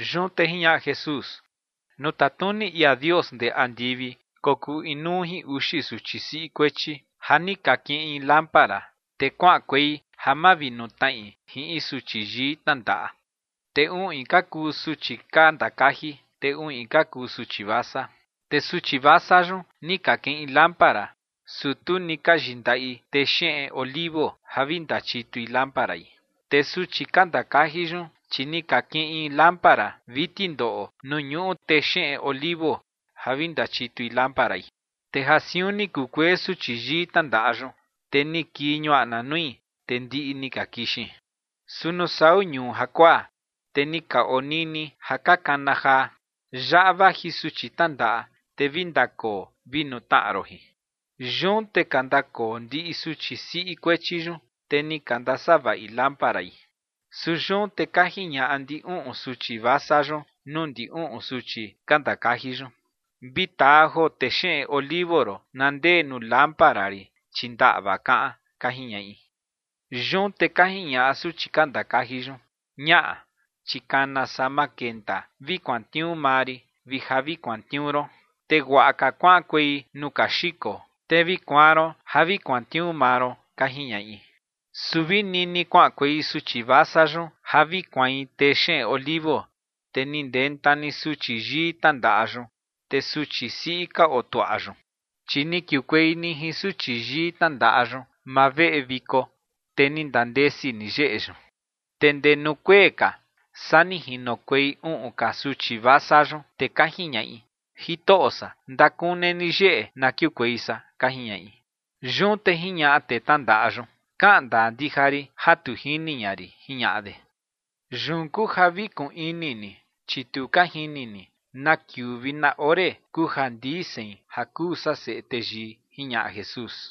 Yun te jiñaꞌa Jesús: ͏―͏Nuu tatnuni ia Dios ndee andivi kokuu inuu jin uxi suchi siꞌi kuechi ja ni ka kiꞌin lámpara, te kuaꞌankuei ja mavinutnaꞌi jin in suchi yii tnandaꞌa. Te uꞌin ka kuu suchi ka ndakaji, te uꞌin ka kuu suchi vasa. Te suchi vasa yun ni ka kiꞌin lámpara, su tu ni ka yindaꞌi texeꞌen olivo ja vi ndachitui lámparai. Te suchi ka ndakaji yun, chi ni ka kiꞌin lámpara vi tindoꞌo nuu ñuꞌu texeꞌen olivo ja vi ndachitui lámparai. Te ja siun ni kukuee suchi yii tnandaꞌa yun, te ni kii ñuaꞌna nui, te ndiꞌi ni ka kixin. Su nuu sau ñuu jakuaa, te ni ka onini ja ka kana jaa: “Yaꞌa vaji suchi tnandaꞌa, te vi ndakoo, vi nutnaꞌa ron jin”. Yun te ka ndakoo ndiꞌi suchi siꞌi kuechi yun, te ni ka ndasavaꞌi lámparai. Su yun te ka jiñaꞌa ndi uꞌun suchi vasa yun nuu ndi uꞌun suchi ka ndakaji yun: “Vi taa joo texeꞌen olivo ron, na ndee nuu lámpara rin, chi ndaꞌva, kaꞌan”, ka jiñaꞌi. Yun te ka jiñaꞌa suchi ka ndakaji yun: “Ñaꞌa, chi kana saa ma kenta vi kuantniuu maa rin vi ja vi kuantniuu ron. Te guaꞌa ka kuaꞌankuei nuu ka xiko, te vi kuaan ron ja vi kuantniuu maa ron”, ka jiñaꞌi. Su vi nini kuaꞌankuei suchi vasa yun ja vi kuain texeꞌen olivo, te ni ndenta ni suchi yii tnandaꞌa yun. Te suchi siꞌi ka otuaꞌa yun, chi ni kiukuei ni jin suchi yii tnandaꞌa yun maa veꞌe viko, te ni ndandesi ni yeꞌe yun. Te ndee nuu kuee ka saa ni jinokuei uꞌun ka suchi vasa yun, te ka jiñaꞌi: “Jitoꞌo san, ndakune ni yeꞌe na kiukuei san”, ka jiñaꞌi. Yun te jiñaꞌa tee tnandaꞌa yun: “Kaꞌan ndaa ndija rin ja tu jini ña rin”, jiñaꞌa de. ’Yun kuu ja vi kuꞌun ini ni, chi tu ka jini ni na kiuu vi na ore kuu ja ndii sein ja kuu san Seꞌe Teyii ͏―͏jiñaꞌa Jesús.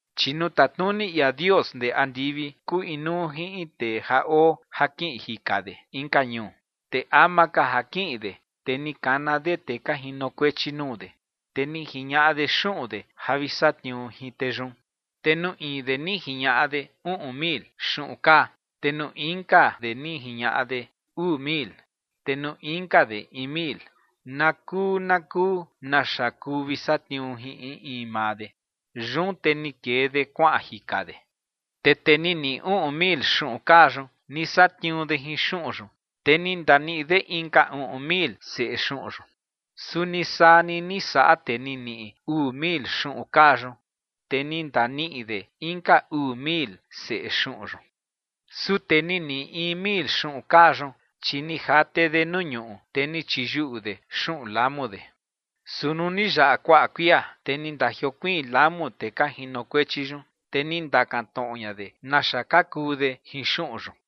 ’Chi nuu tatnuni ia Dios ndee andivi kuu inuu jin in tee ja oo ja kiꞌin jika de inka ñuu. Te ama ka ja kiꞌin de, te ni kana de tee ka jinokuechi nuu de, te ni jiñaꞌa de xuꞌun de ja vi satniuu jin tee yun. ’Te nuu in de ni jiñaꞌa de uꞌun mil xuꞌun kaa, te nuu inka de ni jiñaꞌa de uu mil, te nuu inka de in mil, na kuu na kuu naxa kuu vi satniuu jin in in maa de. Yun te ni kee de kuaꞌan jika de. Te tee ni niꞌi uꞌun mil xuꞌun kaa yun, ni satniuu de jin xuꞌun yun, te ni ndaniꞌi de inka uꞌun mil seꞌe xuꞌun yun. Suni saa ni ni saꞌa tee ni niꞌi uu mil xuꞌun kaa yun, te ni ndaniꞌi de inka uu mil seꞌe xuꞌun yun. Su tee ni niꞌi in mil xuꞌun kaa yun, chi ni jate de nuu ñuꞌu, te ni chiyuꞌu de xuꞌun lamu de. ’Su nuu ni yaꞌa kuaꞌa kuia, te ni ndajiokuiin lamu tee ka jinokuechi yun, te ni ndakan tnoꞌo ña de naxa ka kuu de jin xuꞌun yun.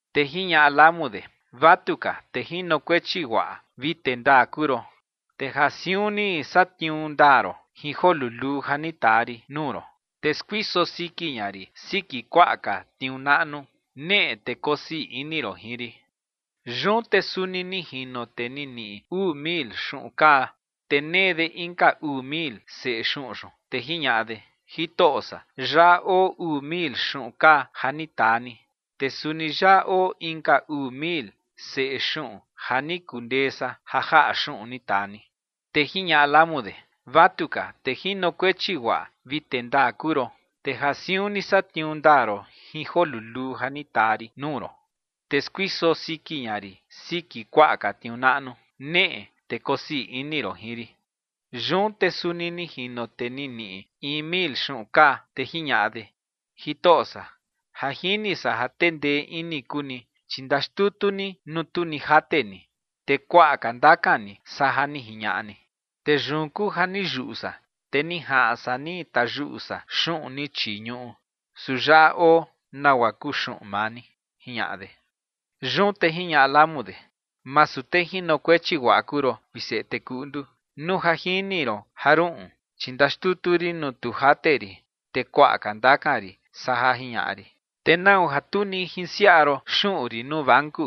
Te jiñaꞌa lamu de: “Vatuka, tee jinokuechi guaꞌa vi tee ndaa kuu ron. Te ja siun ni satniuu ndaa ron jin joo luluu ja ni taa rin nuu ron, te skuiso siki ña rin siki kuaꞌa ka tniuu naꞌnu. Neꞌe te kosii ini ron jin rin.” Yun te suni ni jino tee ni niꞌi uu mil xuꞌun kaa, te nee de inka uu mil seꞌe xuꞌun yun, te jiñaꞌa de: “Jitoꞌo san, yaꞌa oo uu mil xuꞌun kaa ja ni taa ni, te suni yaꞌa oo inka uu mil seꞌe xuꞌun ja ni kundee san ja jaꞌa xuꞌun ni taa ni”. Te jiñaꞌa lamu de: “Vatuka, tee jinokuechi guaꞌa vi tee ndaa kuu ron. Te ja siun ni satniuu ndaa ron jin joo luluu ja ni taa rin nuu ron, te skuiso siki ña rin siki kuaꞌa ka tniuu naꞌnu. Neꞌe te kosii ini ron jin rin.” Yun te suni ni jino tee ni niꞌi in mil xuꞌun kaa, te jiñaꞌa de: “Jitoꞌo san, ja jini san ja tee ndee ini kuu ni, chi ndaxtutu ni nuu tu ni jate ni, te kuaꞌa ka ndakan ni saa ja ni jiñaꞌa ni. Te yun kuu ja ni yuꞌu san, te ni jaꞌan san ni tayuꞌu san xuꞌun ni chii ñuꞌu, su yaꞌa oo nagua kuu xuꞌun maa ni”, jiñaꞌa de. Yun te jiñaꞌa lamu de: “Masu tee jinokuechi guaꞌa kuu ron, vi seꞌe tee kuꞌndu. Nuu ja jini ron ja ruꞌun, chi ndaxtutu rin nuu tu jate rin, te kuaꞌa ka ndakan rin saa ja jiñaꞌa rin, te ¿nau ja tu ni jinsiaꞌa ron xuꞌun rin nuu banku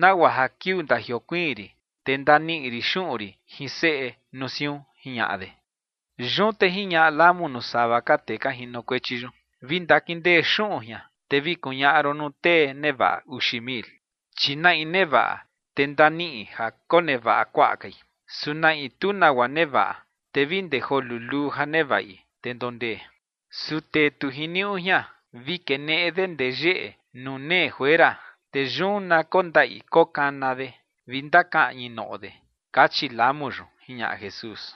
nagua ja kiuu ndajiokuiin rin, te ndaniꞌi rin xuꞌun rin jin seꞌe nuu siun?”, jiñaꞌa de. Yun te jiñaꞌa lamu nuu sava ka tee ka jinokuechi yun: “Vi ndakindee xuꞌun jian, te vi kuñaꞌa ron nuu tee nevaꞌa uxi mil. Chi na in nevaꞌa, te ndaniꞌi ja konevaꞌa kuaꞌa kai. Su na in tu nagua nevaꞌa, te vi ndee joo luluu ja nevaꞌi, te ndondee. Su tee tu jiniuꞌu jian, vi keneꞌe de ndee yeꞌe nuu nee juera, te yun na kondaꞌi kokana de vi ndakaꞌñi noꞌo de”, kachi lamu yun ͏―͏jiñaꞌa Jesús.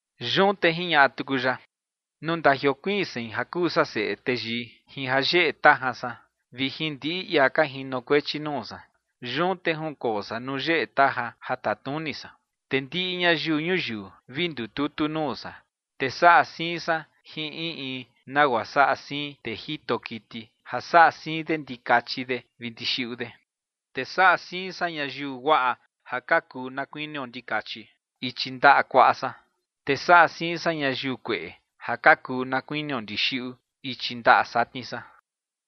Yun te jiñaꞌa tuku ya: ͏―͏Nuu ndajiokuiin sein ja kuu san Seꞌe Teyii jin jayeꞌe tajan san, vi jin ndiꞌi ia ka jinokuechi nuu san, yun te junkoo san nuu yeꞌe tajan ja tatnuni san. Te ndiꞌi ñayiu ñuyiu vi ndututu nuu san, te saꞌa siin san jin in in nagua saꞌa siin in tee jito kiti ja saꞌa siin de ndikachi de vi ndixiꞌu de. Te saꞌa siin san ñayiu guaꞌa ja ka kuu na kuinio ndikachi ichi ndaꞌa kuaꞌa san. Te saꞌa siin san ñayiu kueꞌe ja ka kuu na kuinio ndixiꞌu ichi ndaꞌa satni san.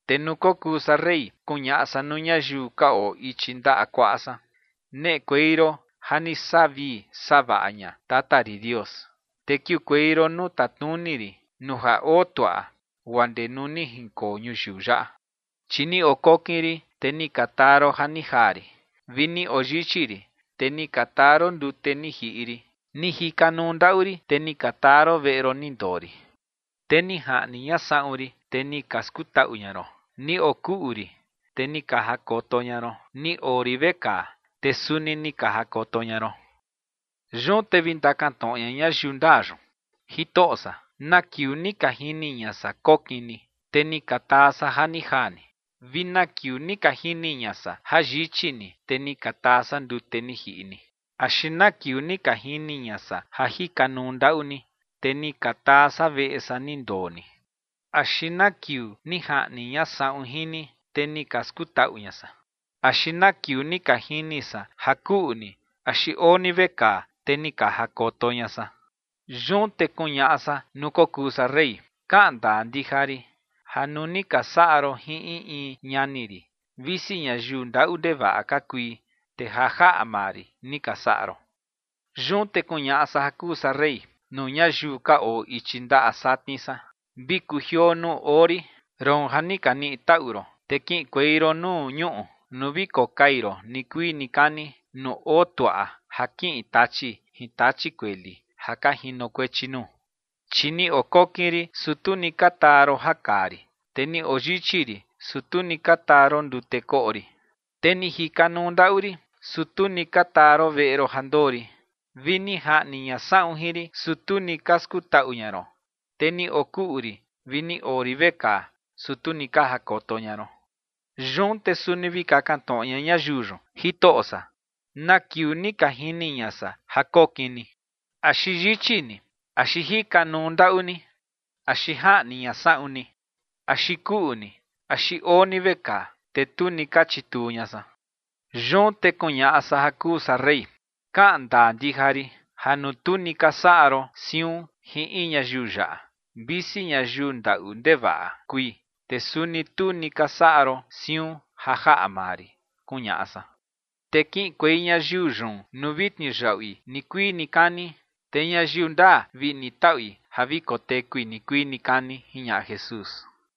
Te nuu kokuu san rey, kuñaꞌa san nuu ñayiu ka oo ichi ndaꞌa kuaꞌa san: “Neꞌekuei ron ja ni saꞌa vii saꞌa vaꞌa ña tata rin Dios, te kiukuei ron nuu tatnuni rin nuu ja oo tuaꞌa guaa ndee nuu ni jinkoo ñuyiu yaꞌa. Chi ni okokin rin, te ni ka taa ron ja ni jaa rin; vi ni oyichi rin, te ni ka taa ron ndute ni jiꞌi rin. Ni jikanuu ndaꞌu rin, te ni ka taa ron veꞌe ron ni ndoo rin. Te ni jaꞌni ña saꞌun rin, te ni ka skutaꞌu ña ron. Ni okuꞌu rin, te ni ka jakoto ña ron. Ni oo rin vekaa, te suni ni ka jakoto ña ron.” Yun te vi ndakantnoꞌo ña ñayiu ndaa yun: “Jitoꞌo san, ¿na kiuu ni ka jini ña san kokin ni, te ni ka taa san ja ni jaa ni? ¿Vi na kiuu ni ka jini ña san ja yichi ni, te ni ka taa san ndute ni jiꞌi ni? ¿Axi na kiuu ni ka jini ña san ja jikanuu ndaꞌu ni, te ni ka taa san veꞌe san ni ndoo ni? ¿Axi na kiuu ni jaꞌni ña saꞌun jin ni, te ni ka skutaꞌu ña san? ¿Axi na kiuu ni ka jini san ja kuꞌu ni axi oo ni vekaa, te ni ka jakoto ña san?” Yun te kuñaꞌa san nuu kokuu san rey: “Kaꞌan ndaa ndija rin ja nuu ni ka saꞌa ron jin in in ñani rin, visi ñayiu ndaꞌu ndevaꞌa ka kui, te ja jaꞌa maa rin ni ka saꞌa ron”. ’Yun te kuñaꞌa san ja kuu san rey nuu ñayiu ka oo ichi ndaꞌa satni san: “Vi kujioo nuu oo rin, roon ja ni ka niꞌi taꞌu ron, te kiꞌinkuei ron nuu ñuꞌu nuu vi kokai ron nikuii nikani, nuu oo tuaꞌa ja kiꞌin Tachi jin tachi kueli ja ka jinokuechi nuu. Chi ni okokin rin, su tu ni ka taa ron ja kaa rin. Te ni oyichi rin, su tu ni ka taa ron ndute koꞌo rin. Te ni jikanuu ndaꞌu rin, su tu ni ka taa ron veꞌe ron ja ndoo rin. Vi ni jaꞌni ña saꞌun jin rin, su tu ni ka skutaꞌu ña ron. Te ni okuꞌu rin vi ni oo rin vekaa, su tu ni ka jakoto ña ron.” Yun te suni vi kakan tnoꞌo ña ñayiu yun: “Jitoꞌo san, ¿na kiuu ni ka jini ña san ja kokin ni, axi yichi ni, axi jikanuu ndaꞌu ni, axi jaꞌni ña saꞌun ni, axi kuꞌu ni, axi oo ni vekaa, te tu ni ka chituu ña san?” Yun te kuñaꞌa san ja kuu san rey: “Kaꞌan ndaa ndija rin ja nuu tu ni ka saꞌa ron siun jin in ñayiu yaꞌa, visi ñayiu ndaꞌu ndevaꞌa kui, te suni tu ni ka saꞌa ron siun ja jaꞌa maa rin”, kuñaꞌa san. Te kiꞌinkuei ñayiu yun nuu vi tniuyaꞌui nikuii nikani. Te ñayiu ndaa, vi niꞌi taꞌui ja vi kotekui nikuii nikani ͏―͏jiñaꞌa Jesús.